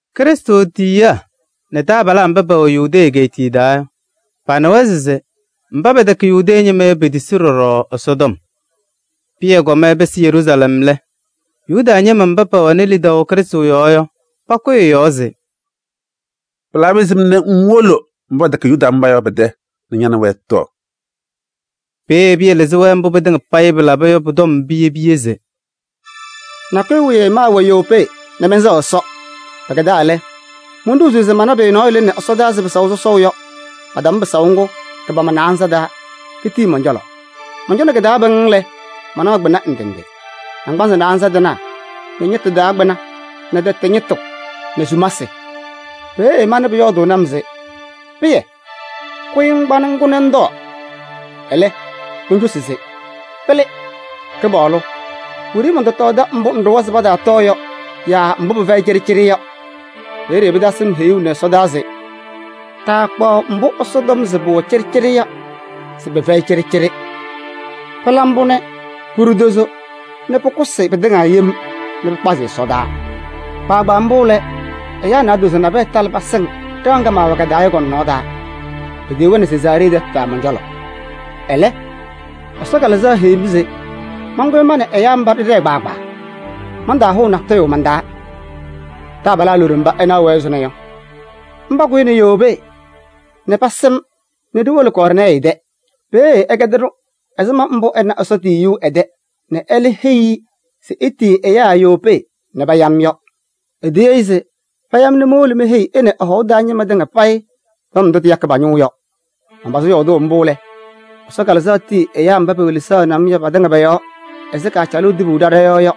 Krɩstʋ tiyiyaa nɛ taabalaa mba pɛwɛ Yudee egeetiye taa yɔ, panɩwa se mba pɛtɛkɛ Yuda ñɩma yɔ, petisi ɖɔɖɔ Ɛsɔtɔm. Pɩyɛ kɔm ɛpɩsɩ Yeruusalɛm lɛ, Yuda ñɩma mba pɛwɛnɩ lidaʋ Krɩstʋ yɔɔ yɔ, pakʋyɩ ɛ-yɔɔ se: “Pɩlabɩ ɛzɩma nɛ ŋwolo mba pɛtɛkɛ Yuda ñɩma yɔ pɛ-tɛ nɛ ña nɛ wɛ ɩtɔɔ?” Peeye Pɩyɛ lɩzɩ-wɛ mbʋ pɩtɩŋa payɩ pɩlaba yɔ pʋ-tɔbʋʋ piye piye se: “Nakʋyʋ wiye maawɛ Yopee nɛ mɛnsɛɣ Ɛsɔ. Pɩkɛdaa lɛ, monɖozuu se mana pʋyʋ nɔɔyʋ lɩnɩ ɛsɔdaa ɛzɩ pɩsaʋ sɔsɔʋ yɔ, patam pɩsaʋ ngʋ kɩ-pama naanza taa nɛ kitii mɔn-cɔlɔ. Mɔncɔnɩ kɩ-taa pɩŋŋ lɛ, manaɣ kpɩna ndɩ ndɩ: naŋgbanzɩ naanza tɩnaa nɛ ñɩtʋ taa kpɩna nɛ tɛtɛ ñɩtʋ nɛ sumasɩ. Peeye manɩ Pʋyɔɔdʋʋnɩ-m se: ‘Pɩyɛ! Kʋyɩ ŋkpa nɛ ŋkʋ nɛ ŋtɔɔ.’ Ɛlɛ, moncosi se: ‘Pɩlɩ! Kɩpaɣlʋ, wiɖiyi mɔntɔtɔɔdɩ mbʋ ŋɖʋwa se pataatɔɔ yɔ yaa mbʋ pɩfɛyɩ cɩɖɩcɩɖɩ yɔ.’ Peeye pɩtasɩ-m heyuu nɛ ɛsɔdaa se: ‘Taakpaɣ mbʋ Ɛsɔ tɔm se pʋwɛ cɩɖɩcɩɖɩ yɔ se pɩfɛyɩ cɩɖɩcɩɖɩ.’ Pɩla mbʋ nɛ pʋɖʋ tozo nɛ pʋkʋsɩ pɩtɩŋa yem nɛ pɩkpazɩ ɛsɔdaa. Kpaagbaa mbʋ lɛ, ɛyaa naadozo nabɛyɛ talɩ pasɩŋ ɖɩɣa ŋga maawɛ ka-taa yɔ kɔ-nɔnɔɔ taa. Petiyi-wɛ nɛ Sezaaree tɛtʋ taa mɔn-cɔlɔ. Ɛlɛ, Ɛsɔ Kalɩzaɣ heyi-m se mankʋyɩ nɛ ma nɛ ɛyaa mba ɖɩɖɛɛ kpaagbaa, mantaahʋʋ man-taa natʋyʋ. Taabalaa loɖo mba ɩnaɣ ɛzʋnɔ yɔ, mba kʋyɩnɩ Yopee nɛ pasɩ-m nɛ ɖiwolo Kɔɔrnɛɛyɩ tɛ. Peeye ɛkɛdɩ-ɖʋ ɛzɩma mbʋ ɛna Ɛsɔ tiyiyu ɛ-tɛ nɛ ɛlɛ heyi-i se etiyi ɛyaa Yopee nɛ paya-m yɔ. Etiyi-i se paya-m nɛ mowolo meheyi ɛ nɛ ɛ-hɔʋ taa ñɩma tɩŋa payɩ tɔm ndʋ tɩyakɩ pa-ñʋʋ yɔ. Manpazɩ yɔɔdʋʋ mbʋ lɛ, Ɛsɔ Kalɩzaɣ tii ɛyaa mba pewelesaɣnɩ-m yɔ patɩŋa pɔ-yɔɔ ɛzɩ kaacalʋʋ tibu ɖa ɖɔ-yɔɔ yɔ.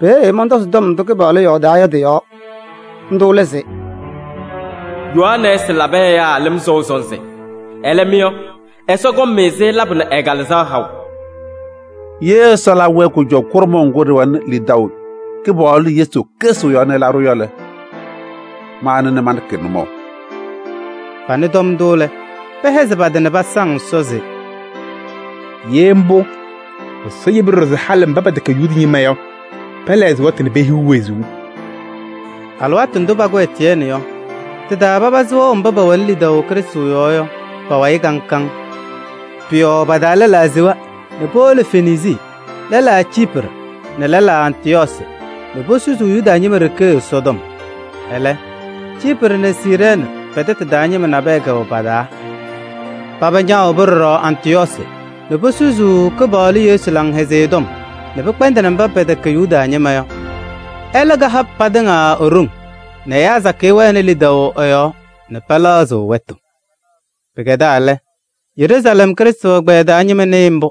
Peeye mɔntɔzɩ tɔm ndʋ Kɩpaɣlʋ yɔɔdaa yɔ tɩ-yɔɔ. Ndʋ lɛ se: ‘Yohanɛɛsɩ labɩ ɛyaa lɩm sɔʋ sɔnzɩ. Ɛlɛ, mɩ yɔ, Ɛsɔ kɔŋ-mɩ-sɩ labʋ nɛ ɛ-Kalɩzaɣ haʋ.’ Ye Ɛsɔ ɛlabɩ-wɛ kʋjɔʋ kʋɖʋmʋʋ ŋgʋ ɖɩwɛnɩ lidaʋ Kɩpaɣlʋ Yesu Krɩstʋ yɔɔ nɛ ɛlabɩ-ɖʋ yɔ lɛ, ma anɩ nɛ manɖɩkɩ-ɩ nʋmɔʋ?” Panɩ tɔm ndʋ lɛ, pɛhɛzɩ pa-tɩ nɛ pasaŋ Ɛsɔ se: “Ye mbʋ, Ɛsɔ yebi ɖɔɖɔ se halɩ mba pɛtɛkɛ Yuda ñɩma yɔ, pɛlɛɣzɩ wɛtʋ nɛ pehiɣ wezuu!” Alɩwaatʋ ndʋ pakʋ Etiyɛɛnɩ yɔ, tɩ-taa papazɩ wɛʋ mba pɛwɛnɩ lidaʋ Krɩstʋ yɔɔ yɔ pa-wayɩ kaŋ kaŋ. Pʋ-yɔɔ pa-taa lɛlaa sewa nɛ powolo Fenisii nɛ lɛlaa Ciiprɩ nɛ lɛlaa Antɩyɔɔsɩ nɛ posusuu Yuda ñɩma ɖeke Ɛsɔtɔm. Ɛlɛ, Ciiprɩ nɛ Siirɛɛnɩ pɛ-tɛtʋ taa ñɩma nabɛyɛ kɛwɛ pa-taa. Paba ñaawobi ɖɔɖɔ Antɩyɔɔsɩ nɛ posusuu Kɩpaɣlʋ Yesu Laŋhɛzɩyɛ Tɔm nɛ pɛkpɛndɩnɩ mba pɛtɛkɛ Yuda ñɩma yɔ. Ɛlɛ kaha patɩŋa e-ɖoŋ nɛ ɛyaa sakɩyɛ wɛnɩ lidaʋ ɛ-yɔɔ nɛ pɛlɛɣzɩ wɛtʋ. Pɩkɛdaa lɛ, Yeruusalɛm Krɩstʋ ɛgbɛyɛ taa ñɩma nɩɩ mbʋ.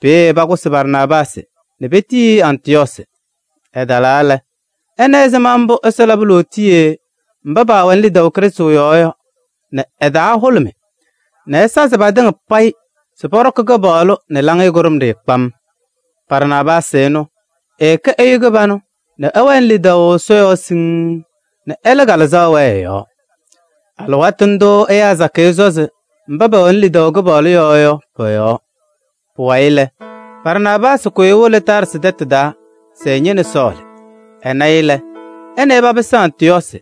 Peeye pakʋsɩ Barnaabaasɩ nɛ petiyi-i Antɩyɔɔsɩ. Ɛtalaa lɛ, ɛna ɛzɩma mbʋ Ɛsɔ labɩ lootiye mba pɛwɛnɩ lidaʋ Krɩstʋ yɔɔ yɔ nɛ ɛ-taa hʋlʋmɩ nɛ ɛsazɩ patɩŋa payɩ se pɔɖɔkɩ Kɩpaɣlʋ nɛ laŋɩyɛ kʋɖʋmɖɩyɛ kpam. Barnaabaasɩ ɛnʋ, ɛɛkɛ ɛyʋ kɩbanʋ nɛ ɛwɛnɩ lidaʋ Ɛsɔ yɔɔ siŋŋ nɛ ɛlɛ Kalɩzaɣ wɛɛ ɛ-yɔɔ. Alɩwaatʋ ndʋʋ ɛyaa sakɩyɛ sɔzɩ mba pɛwɛnɩ lidaʋ Kɩpaɣlʋ yɔɔ yɔ pɔ-yɔɔ. Pʋwayɩ lɛ, Barnaabaasɩ kʋyɩ ewolo Taarsɩ tɛtʋ taa se ɛñɩnɩ Sɔɔlɩ. Ɛna-ɩ lɛ, ɛ nɛ ɩ papɩsɩ Antɩyɔɔsɩ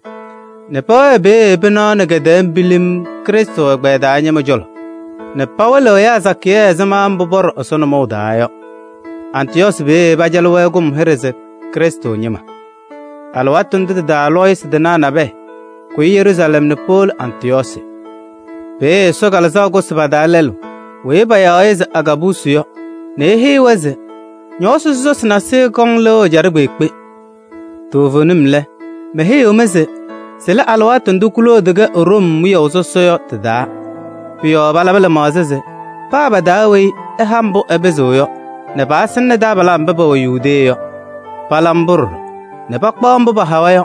nɛ pɛwɛɛ peeye pɩnaɣ nɛ kɛ-tɛɛ pilim Krɩstʋ ɛgbɛyɛ taa ñɩma cɔlɔ nɛ pawɩlɩɣ ɛyaa sakɩyɛ ɛzɩma mbʋ pɔɖɔ Ɛsɔ nɔmɔʋ taa yɔ. Antɩyɔɔsɩ peeye pacalɩ-wɛ kʋm hɩɖɛ se Krɩstʋ ñɩma. Alɩwaatʋ ndʋ tɩ-taa lɔɔyɩsɩ tɩnaa nabɛyɛ kʋyɩ Yeruusalɛm nɛ powolo Antɩyɔɔsɩ. Peeye Ɛsɔ Kalɩzaɣ kʋsɩ pa-taa lɛlʋ weyi payaɣ se Agaabusi yɔ nɛ eheyi-wɛ se ñɔɔsɩ sɔsɔsɩ nasɩyɩ kɔŋ lɩʋ ɛjaɖɛ kpeekpe. Toovenim lɛ, meheyiɣ-mɩ se sɩlɩ alɩwaatʋ ndʋ Kloodi kɛ Room wiyaʋ sɔsɔ yɔ tɩ-taa. Pʋ-yɔɔ palabɩ lɩmaɣza se paa pa-taa weyi ɛha mbʋ ɛpɩzɩɣ yɔ nɛ pasɩnɩnɩ taabalaa mba pɛwɛ Yudee yɔ. Pala mbʋ ɖɔɖɔ nɛ pakpaɣ mbʋ pahawa yɔ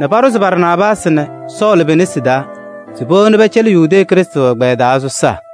nɛ paɖʋzɩ Barnaabaasɩ nɛ Sɔɔlɩ pe-nesi taa se powoni pɛcɛlɩ Yudee Krɩstʋ ɛgbɛyɛ taa sɔsaa.